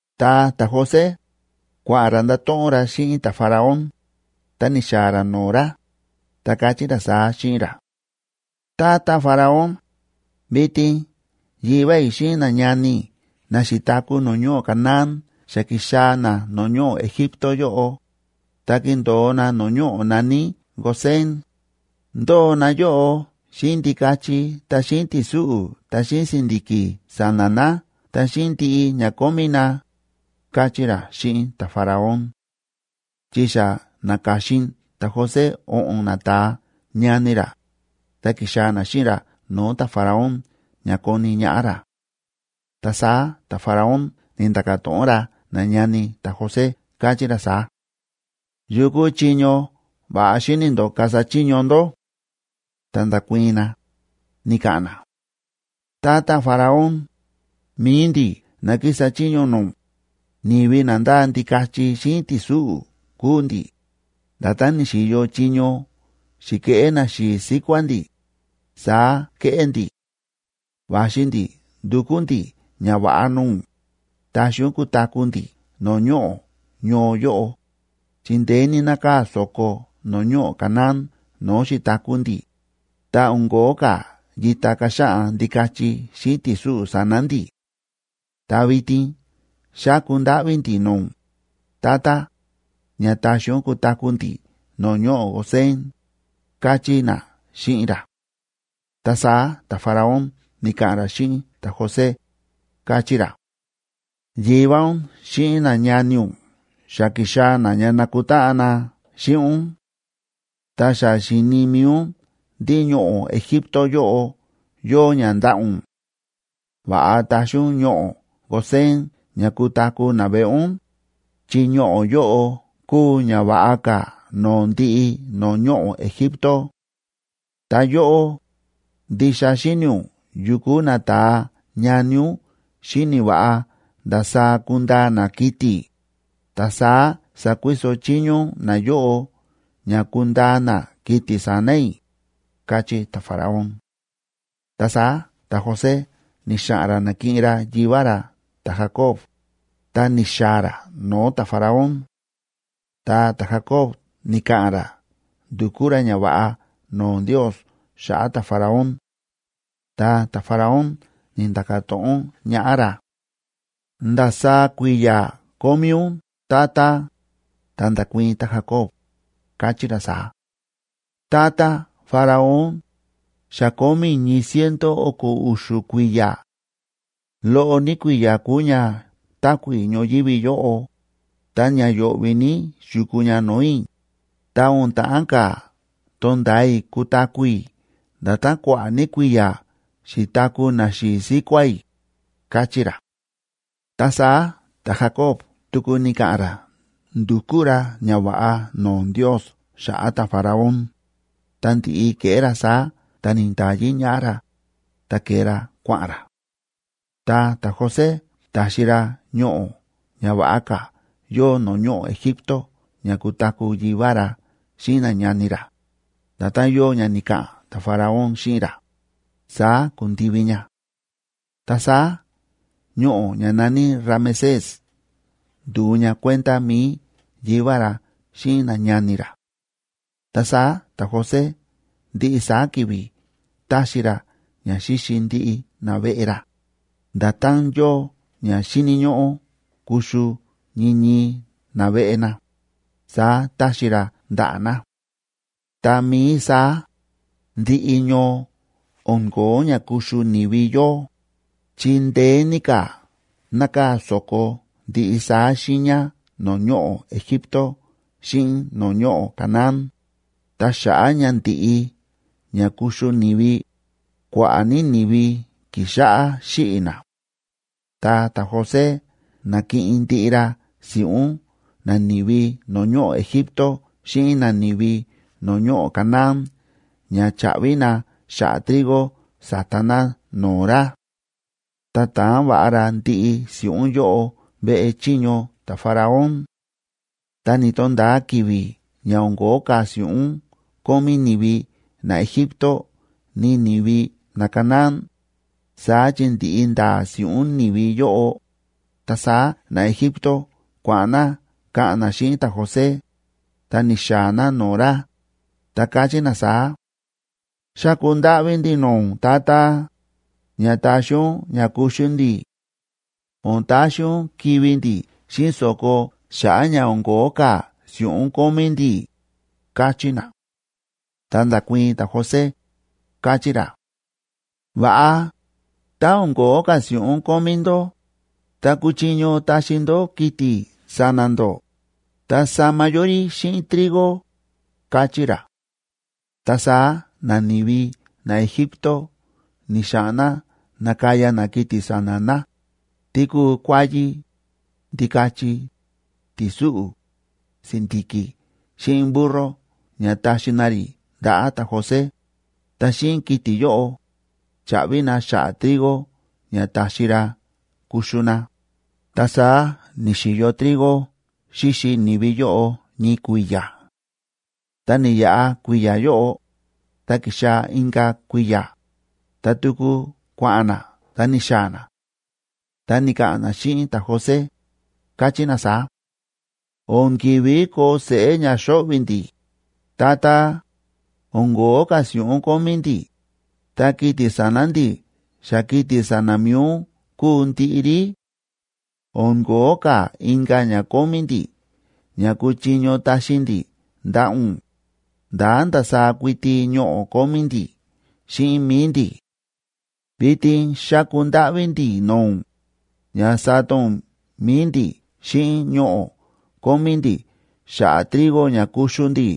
Ta ta̱José kua̱ꞌa̱n ra ndato̱ꞌon ra xíꞌin ta̱Faraón, ta ni̱xaa̱ ra no̱o̱ ra, ta káchí ra saá xíꞌin ra: ―Tata Faraón, vitin yivá i̱ xíꞌin nañani i̱ na xi̱taku̱ no̱o̱ ñoꞌo̱ Canaán xa ki̱xaa̱ na no̱o̱ ñoꞌo̱ Egipto yóꞌo, ta kíndo̱o na no̱o̱ ñoꞌo̱ na̱ní Gosén, ndóo na yóꞌo xíꞌin ndikachi ta xíꞌin ti̱súꞌu̱ ta xíꞌin si̱ndi̱ki̱ sa̱na̱ na ta xíꞌin ndiꞌi ña kómí na ―káchí ra xíꞌin ta̱Faraón. Chi xa na̱ka̱xin ta̱José o̱ꞌo̱n nata̱a ñani ra, ta ki̱xaa̱ na xíꞌin ra no̱o̱ ta̱Faraón ña koni ñaꞌá ra. Ta saá ta̱Faraón ni̱nda̱ka̱ to̱ꞌon ra nañani ta̱José, káchí ra saá: ―¿Yukú chiño va̱ꞌa xíni̱ ndó kasa chiño ndó? Ta nda̱kuii̱n na, ni̱ka̱ꞌa̱n na: ―Tata Faraón, mi̱i ndi̱ na kísa chiño no̱o̱ ún, ni̱vi na ndáa ndikachi xíꞌin ti̱súꞌu̱ kúu ndi̱, nda̱tán ni̱xi̱yo chiño xi̱keꞌé naxi̱i̱ síkuá ndi̱, saá kéꞌé ndi̱. Va̱xi ndi̱ ndukú ndi̱ ñava̱ꞌa no̱o̱ ún, taxi ún kutaku̱ ndi̱ no̱o̱ ñoꞌo̱ ñoo yóꞌo, chi ndeé ní nákaa̱ so̱ko no̱o̱ ñoꞌo̱ Canaán no̱o̱ xi̱taku̱ ndi̱, ta o̱n ko̱ó ka̱ yita kaxaꞌan ndikachi xíꞌin ti̱súꞌu̱ sa̱na̱ ndi̱. Ta vitin xáku ndáꞌví ndi̱ no̱o̱ ún, tata, ña taxi ún kutaku̱ ndi̱ no̱o̱ ñoꞌo̱ Gosén ―káchí na xíꞌin ra. Ta saá ta̱Faraón ni̱ka̱ꞌa̱n ra xíꞌin ta̱José, káchí ra: ―Yivá ún xíꞌin nañani ún xa ki̱xaa̱ na ña nakutáꞌan na xíꞌin ún. Ta xa xíni̱ mi̱i ún ndí ñoꞌo̱ Egipto yóꞌo yóo ña ndaꞌa̱ ún. Va̱ꞌa taxi ún ñoꞌo̱ Gosén ña kutaku̱ naveꞌe ún, chi ñoꞌo̱ yóꞌo kúu ña va̱ꞌa ka̱ no̱o̱ ndiꞌi no̱o̱ ñoꞌo̱ Egipto. Ta yóꞌó, ndixa xíni̱ ún yukú nata̱a ñani ún xíni̱ va̱ꞌa ndasaá kundaa na kiti̱, ta saá sakuiso chiño ún nayóꞌo ña kundaa na kiti̱ sa̱na̱ i̱ ―káchí ta̱Faraón. Ta saá ta̱José ni̱xa̱ꞌa̱n ra nakiꞌin ra yivá ra ta̱Jacob, ta ni̱xaa̱ ra no̱o̱ ta̱Faraón. Ta ta̱Jacob ni̱ka̱ꞌa̱n ra ndu̱kú ra ñava̱ꞌa no̱o̱ Ndios xa̱ꞌa̱ ta̱Faraón. Ta ta̱Faraón ni̱nda̱ka̱ to̱ꞌon ñaꞌá ra: ―¿Ndasaá kui̱ya̱ kómí ún?, tata. Ta nda̱kuii̱n ta̱Jacob, káchí ra saá: ―Tata Faraón, xa kómí i̱ ñii ciento o̱ko̱ u̱xu̱ kui̱ya̱. Loꞌo ní kui̱ya̱ kúu ña táku̱ i̱ ñoyívi yóꞌo, ta ña yo̱ꞌvi̱ ní xi̱kuu ña no̱o̱ i̱, ta o̱n ta̱ꞌán ka̱ to̱nda̱a i̱ kutaku̱ i̱ nda̱tán kua̱ꞌa̱ ní kui̱ya̱ xi̱taku̱ naxi̱i̱ síkuá i̱ ―káchí ra. Ta saá ta̱Jacob tuku ni̱ka̱ꞌa̱n ra ndu̱kú ra ñava̱ꞌa no̱o̱ Ndios xa̱ꞌa̱ ta̱Faraón, ta ndi̱ꞌi ke̱ꞌé ra saá ta ni̱nda̱yi ñaꞌá ra, ta ke̱e ra kua̱ꞌa̱n ra. Ta ta̱José ta̱xi ra ñoꞌo̱ ña va̱ꞌa ka̱ yóo no̱o̱ ñoꞌo̱ Egipto ña kutaku̱ yivá ra xíꞌin nañani ra, nda̱tán yóo ña ni̱ka̱ꞌa̱n ta̱Faraón xíꞌin ra, saá ku̱ndivi ña. Ta saá ñoꞌo̱ ña na̱ní Ramesésa ndu̱u ña kuenda mi̱i yivá ra xíꞌin nañani ra. Ta saá ta̱José ndiꞌi saá ki̱vi̱ táxi ra ña xíxi ndiꞌi naveꞌe ra, nda̱tán yóo ña xíni̱ ñóꞌó kuxu ñii ñii naveꞌe na, saá táxi ra ndaꞌa̱ na. Tá mií saá, ndiꞌi ñoo o̱n ko̱ó ña kuxu ni̱vi yóo, chi ndeé ní ka̱ nákaa̱ so̱ko ndiꞌi saá xiiña no̱o̱ ñoꞌo̱ Egipto xíꞌin no̱o̱ ñoꞌo̱ Canaán, ta xa̱ꞌa̱ ña ndi̱ꞌi ña kuxu ni̱vi, kua̱ꞌa̱ ní ni̱vi ki̱xáꞌá xíꞌi̱ na. Ta ta̱José na̱kiꞌin ndiꞌi ra si̱ꞌún nani̱vi no̱o̱ ñoꞌo̱ Egipto xíꞌin nani̱vi no̱o̱ ñoꞌo̱ Canaán ña cha̱ꞌvi na xa̱ꞌa̱ trigo sa̱ta na no̱o̱ ra, ta ta̱an va̱ꞌa ra ndiꞌi si̱ꞌún yóꞌo veꞌe chiño ta̱Faraón. Tá ni̱to̱nda̱a ki̱vi̱ ña o̱n ko̱ó ka̱ si̱ꞌún kómí ni̱vi naEgipto ni ni̱vi naCanaán, saá chi ndi̱ꞌi ndaa si̱ꞌún ni̱vi yóꞌo, ta saá naEgipto kua̱ꞌa̱n na ka̱ꞌa̱n na xíꞌin ta̱José, ta ni̱xaa̱ na no̱o̱ ra, ta káchí na saá: ―Xáku ndáꞌví ndi̱ no̱o̱ ún, tata, ña taxi ún ña kuxu ndi̱. O̱n taxi ún kivi̱ ndi̱ xíꞌin so̱ko xa̱ꞌa̱ ña o̱n ko̱ó ka̱ si̱ꞌún kómí ndi̱ ―káchí na. Ta nda̱kuii̱n ta̱José, káchí ra: ―Va̱ꞌa, tá o̱n ko̱ó ka̱ si̱ꞌún kómí ndó, ta kúchiño taxi ndó kiti̱ sa̱na̱ ndó, ta sama yó rí xíꞌin trigo ―káchí ra. Ta saá nani̱vi naEgipto ni̱xa̱ꞌa̱n na na̱kaya na kiti̱ sa̱na̱ na, tí kúu kuáyí, ndikachi, ti̱súꞌu̱, si̱ndi̱ki̱ xíꞌin burro ña taxi na rí ndaꞌa̱ ta̱José, ta xíꞌin kiti̱ yóꞌo, cha̱ꞌvi na xa̱ꞌa̱ trigo ña ta̱xi ra kuxu na, ta saá ni̱xi̱yo trigo xíxi ni̱vi yóꞌo ñii kui̱ya̱. Ta ni̱yaꞌa kui̱ya̱ yóꞌo, ta ki̱xaa̱ inka̱ kui̱ya̱, ta tuku kua̱ꞌa̱n na ta ni̱xaa̱ na, ta ni̱ka̱ꞌa̱n na xíꞌin ta̱José, káchí na saá: ―O̱n ki̱ví koo seꞌé ña xóꞌvi̱ ndi̱, tata. O̱n ko̱ó ka̱ si̱ꞌún kómí ndi̱, ta kiti̱ sa̱na̱ ndi̱ xa kiti̱ sa̱na̱ mi̱i ún kúu ndiꞌi rí; o̱n ko̱ó ka̱ inka̱ ña kómí ndi̱ ña kúchiño taxi ndi̱ ndaꞌa̱ ún, ndá ndasaá kuiti ñoꞌo̱ kómí ndi̱ xíꞌin mi̱i ndi̱. Vitin xáku ndáꞌví ndi̱ no̱o̱ ún, ña sata ún mi̱i ndi̱ xíꞌin ñoꞌo̱ kómí ndi̱ xa̱ꞌa̱ trigo ña kuxu ndi̱,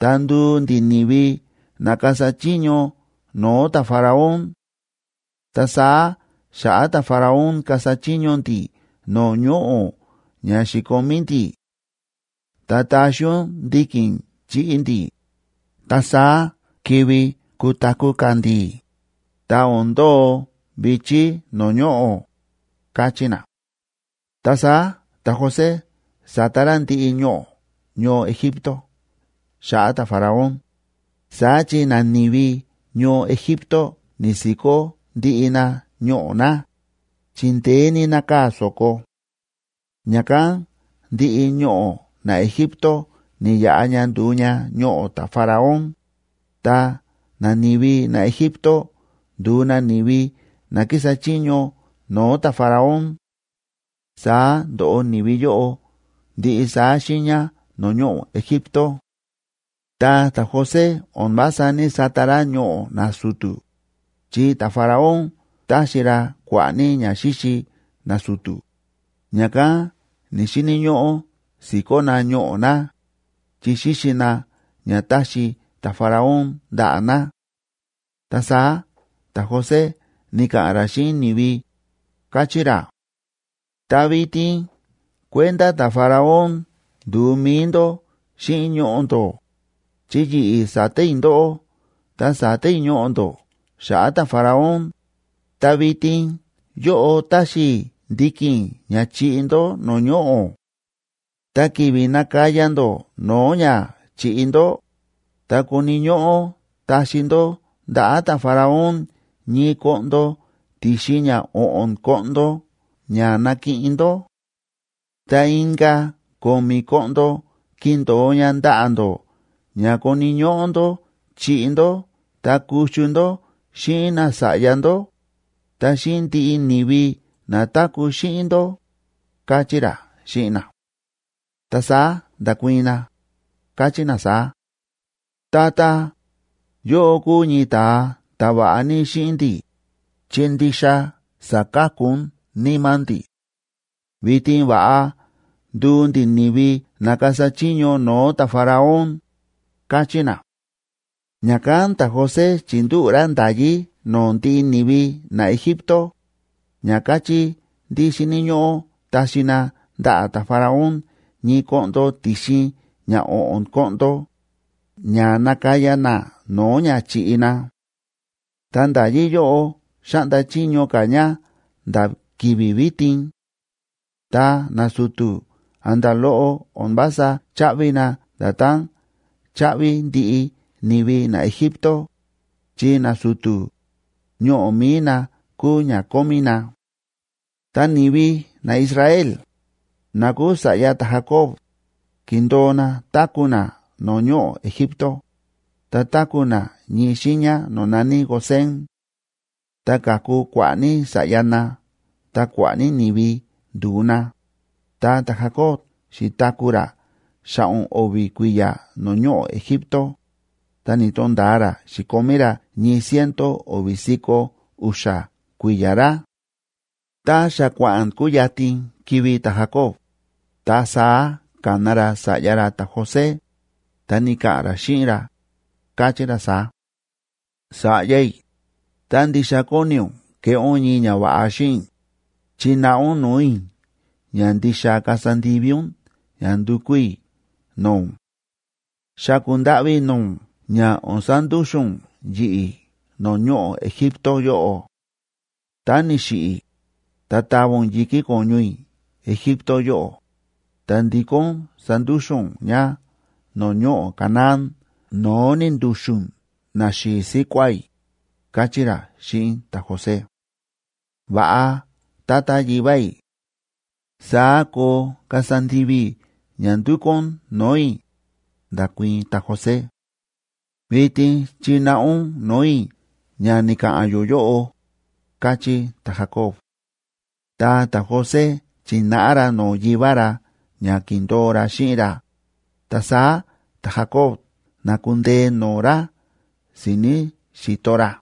ta nduu ndi̱ ni̱vi na kasa chiño no̱o̱ ta̱Faraón, ta saá xa̱ꞌa̱ ta̱Faraón kasa chiño ndi̱ no̱o̱ ñoꞌo̱ ña xi̱komí ndi̱. Ta taxi ún ndiki̱n chiꞌi ndi̱, ta saá kivi kutaku̱ ka̱ ndi̱, ta o̱n ndo̱o vi̱chí no̱o̱ ñoꞌo̱ ―káchí na. Ta saá ta̱José sa̱ta ra ndiꞌi ñoꞌo̱ ñoo Egipto xa̱ꞌa̱ ta̱Faraón, saá chi nani̱vi ñoo Egipto ni̱si̱kó ndiꞌi na ñoꞌo̱ na, chi ndeé ní nákaa̱ so̱ko. Ña̱kán ndiꞌi ñoꞌo̱ naEgipto ni̱yaꞌa ña ndu̱u ña ñoꞌo̱ ta̱Faraón, ta nani̱vi naEgipto ndu̱u na ni̱vi na kísa chiño no̱o̱ ta̱Faraón.b Saá ndo̱ꞌo ni̱vi yóꞌo ndiꞌi saá xiiña no̱o̱ ñoꞌo̱ Egipto. Ta ta̱José o̱n vása ní‑sata ra ñoꞌo̱ nasu̱tu̱, chi ta̱Faraón táxi ra kua̱ꞌa̱ ní ña xíxi nasu̱tu̱, ña̱kán ni̱‑xini̱ ñóꞌó si̱kó na ñoꞌo̱ na, chi xíxi na ña táxi ta̱Faraón ndaꞌa̱ na. Ta saá ta̱José ni̱ka̱ꞌa̱n ra xíꞌin ni̱vi, káchí ra: ―Ta vitin kuenda ta̱Faraón ndu̱u mi̱i ndó xíꞌin ñoꞌo̱ ndó, chi yi̱ꞌi̱ sa̱ta i̱ ndóꞌó ta sa̱ta i̱ ñoꞌo̱ ndó xa̱ꞌa̱ ta̱Faraón, ta vitin yóꞌo táxi i̱ ndiki̱n ña chiꞌi ndó no̱o̱ ñoꞌo̱. Ta ki̱vi̱ nakaya ndó no̱o̱ ña chi̱ꞌi ndó, ta koni̱ ñóꞌó taxi ndó ndaꞌa̱ ta̱Faraón ñii koꞌndo ti̱xin ña o̱ꞌo̱n koꞌndo ña nakiꞌin ndó. Ta inka̱ ko̱mi̱ koꞌndo kindo̱o ña ndaꞌa̱ ndó ña koni̱ ñóꞌó ndó chiꞌi ndó ta kuxu ndó xíꞌin nasa̱ꞌya ndó, ta xíꞌin ndiꞌi ni̱vi na táku̱ xíꞌin ndó ―káchí ra xíꞌin na. Ta saá nda̱kuii̱n na, káchí na saá: ―Tata, yóꞌó kúu ñii ta̱a ta̱ va̱ꞌa ní xíꞌin ndi̱, chi ndixa sa̱ka̱ku ún níma̱ ndi̱. Vitin va̱ꞌa nduu ndi̱ ni̱vi na kasa chiño no̱o̱ ta̱Faraón ―káchí na. Ña̱kán ta̱José chi̱ndúꞌu̱ ra nda̱yí no̱o̱ ndiꞌi ni̱vi naEgipto ña káchí ndí xíni̱ ñóꞌó taxi na ndaꞌa̱ ta̱Faraón ñii koꞌndo ti̱xin ña o̱ꞌo̱n koꞌndo ña nakaya na no̱o̱ ña chi̱ꞌi na. Ta nda̱yí yóꞌo xáꞌnda chiño ka̱ ña nda̱ ki̱vi̱ vitin. Ta nasu̱tu̱ a̱nda̱ loꞌo o̱n vása cháꞌvi na nda̱tán cháꞌvi ndiꞌi ni̱vi naEgipto, chi nasu̱tu̱, ñoꞌo̱ mi̱i na kúu ña kómí na. Ta ni̱vi naIsrael, na kúu sa̱ꞌya ta̱Jacob, ki̱ndo̱o na táku̱ na no̱o̱ ñoꞌo̱ Egipto, ta táku̱ na ñii xiiña no̱o̱ na̱ní Gosén. Ta ka̱ku kua̱ꞌa̱ ní sa̱ꞌya na ta kua̱ꞌa̱ ní ni̱vi ndu̱u na. Ta ta̱Jacob xi̱taku̱ ra xa̱ꞌo̱n o̱vi̱ kui̱ya̱ no̱o̱ ñoꞌo̱ Egipto, ta ni̱to̱nda̱a ra xi̱komí ra ñii ciento o̱vi̱ si̱ko̱ u̱xa̱ kui̱ya̱ ra. Tá xa kua̱ꞌa̱n kuyatin kivi̱ ta̱Jacob,c ta saá ka̱na ra sa̱ꞌya ra ta̱José, ta ni̱ka̱ꞌa̱n ra xíꞌin ra, káchí ra saá: ―Sa̱ꞌya i̱, tá ndixa kóni ún keꞌé ún ñii ñava̱ꞌa xíꞌin i̱, chináꞌa ún no̱o̱ i̱ ña ndixa kasa ndivi ún ña ndukú i̱ no̱o̱ ún. Xáku ndáꞌví i̱ no̱o̱ ún ña o̱n sandúxu̱n ún yi̱ꞌi̱ no̱o̱ ñoꞌo̱ Egipto yóꞌo. Tá ni̱xiꞌi̱ i̱, ta tava ún yi̱kí ko̱ñu i̱ Egipto yóꞌo, ta ndikó ún sandúxu̱n ún ña no̱o̱ ñoꞌo̱ Canaán no̱o̱ ni̱ndu̱xu̱n naxi̱i̱ síkuá i̱ ―káchí ra xíꞌin ta̱José. ―Va̱ꞌa, tata yivá i̱, saá koo kasa ndivi i̱ ña ndúkú ún no̱o̱ i̱ ―nda̱kuii̱n ta̱José. ―Vitin chináꞌa ún no̱o̱ i̱ ña ni̱ka̱ꞌa̱n yó yóꞌo ―káchí ta̱Jacob. Ta ta̱José chi̱náꞌa ra no̱o̱ yivá ra ña ki̱ndo̱o ra xíꞌin ra, ta saá ta̱Jacob na̱kundee no̱o̱ ra si̱ni̱ xi̱to ra.